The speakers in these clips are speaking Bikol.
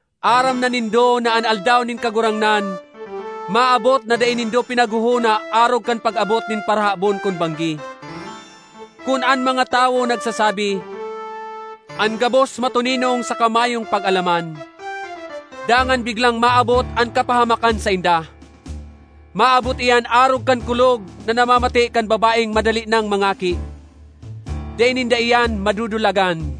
Aram na nindo na an Aldaw nin Kagurangnan maabot na dai nindo pinaghohona arog kan pag-abot nin parahabon kun banggi. Kun an mga tawo nagsasabi, “An gabos matoninong saka mayong pag-alaman,” dangan biglang maabot an kapahamakan sainda! Maabot iyan arog kan kulog na namamate kan babaeng madali nang mangaki; dai ninda iyan madudulagan.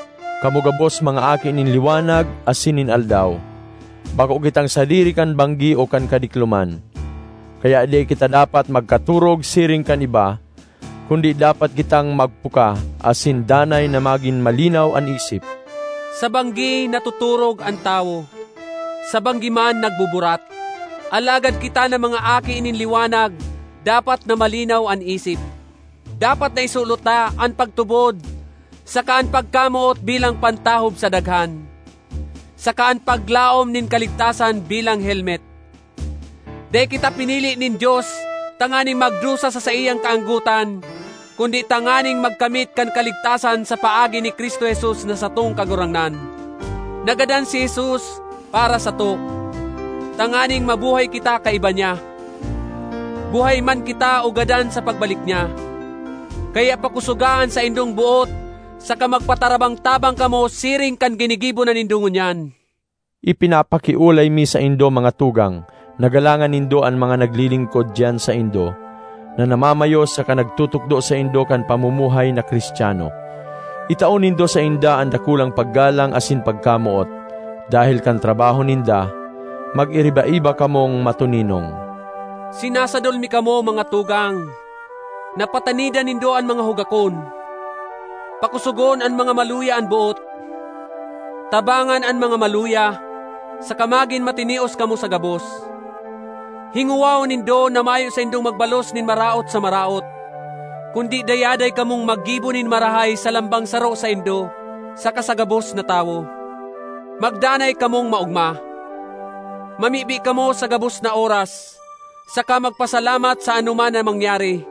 Kamo gabos mga aki nin liwanag asin nin aldaw. Bako kitang sadiri kan banggi o kan kadikloman. Kaya dai kita dapat magkatorog siring kan iba, kundi dapat kitang magpuka asin danay na magin malinaw an isip. Sa banggi natotorog an tawo; sa banggi man nagbuburat. Alagad kita na mga aki nin liwanag dapat na malinaw an isip. Dapat na isulot ta an pagtubod saka an pagkamoot bilang pantahob sa daghan, saka an paglaom nin kaligtasan bilang helmet. Dai kita pinili nin Dios tanganing magdusa sa saiyang kaanggotan kundi tanganing magkamit kan kaligtasan sa paagi ni Cristo Jesus na satong Kagurangnan. Nagadan si Jesus para sato, tanganing mabuhay kita kaiba niya, buhay man kita o gadan sa pagbalik niya. Kaya pakosoga an saindong boot saka magpatarabang-tabang kamo siring kan ginigibo na nindo ngunyan. Ipinapakiolay mi saindo, mga tugang, na galangan nindo an mga naglilingkod diyan saindo, na namamayo saka nagtutukdo saindo kan pamumuhay na Cristiano. Itao nindo sainda an dakulang paggalang asin pagkamoot, dahel kan trabaho ninda. Magiriba-iba kamong matoninong. Sinasadol mi kamo, mga tugang, na patanidan nindo an mga hugakon, pakosogon an mga maluya an boot, tabangan an mga maluya, saka magin matinios kamo sa gabos. Hingowahon nindo na mayo saindong magbalos nin maraot sa maraot, kundi dayaday kamong maggibo nin marahay sa lambang saro saindo saka sa gabos na tawo. Magdanay kamong maogma. Mamibi kamo sa gabos na oras, saka magpasalamat sa anoman na mangyari.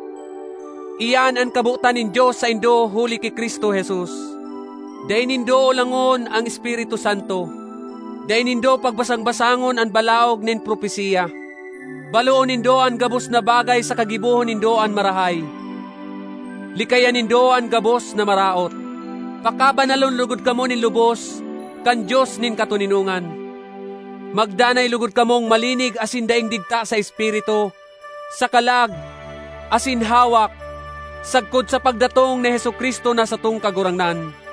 Iyan an kabotan nin Dios saindo huli ki Cristo Jesus. Dai nindo olangon an Espiritu Santo; dai nindo pagbasang-basangon an balaog nin propesiya. Baloon nindo an gabos na bagay saka gibohon nindo an marahay. Likayan nindo an gabos na maraot. Pakabanalon logod kamo nin lubos kan Dios nin katoninongan; magdanay logod kamong malinig asin daing digta sa espiritu, sa kalag, asin hawak, sagkod sa pagdatong ni Jesu-Cristo na satong Kagurangnan.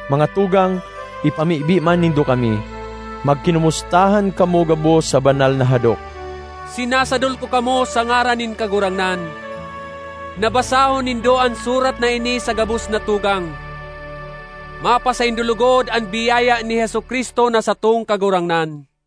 Mga tugang, ipamibi man nindo kami. Magkinomustahan kamo gabos sa banal na hadok. Sinasadol ko kamo, sa ngaran nin Kagurangnan, na basahon nindo an surat na ini sa gabos na tugang. Mapasaindo logod an biyaya ni Jesu-Cristo na satong Kagurangnan.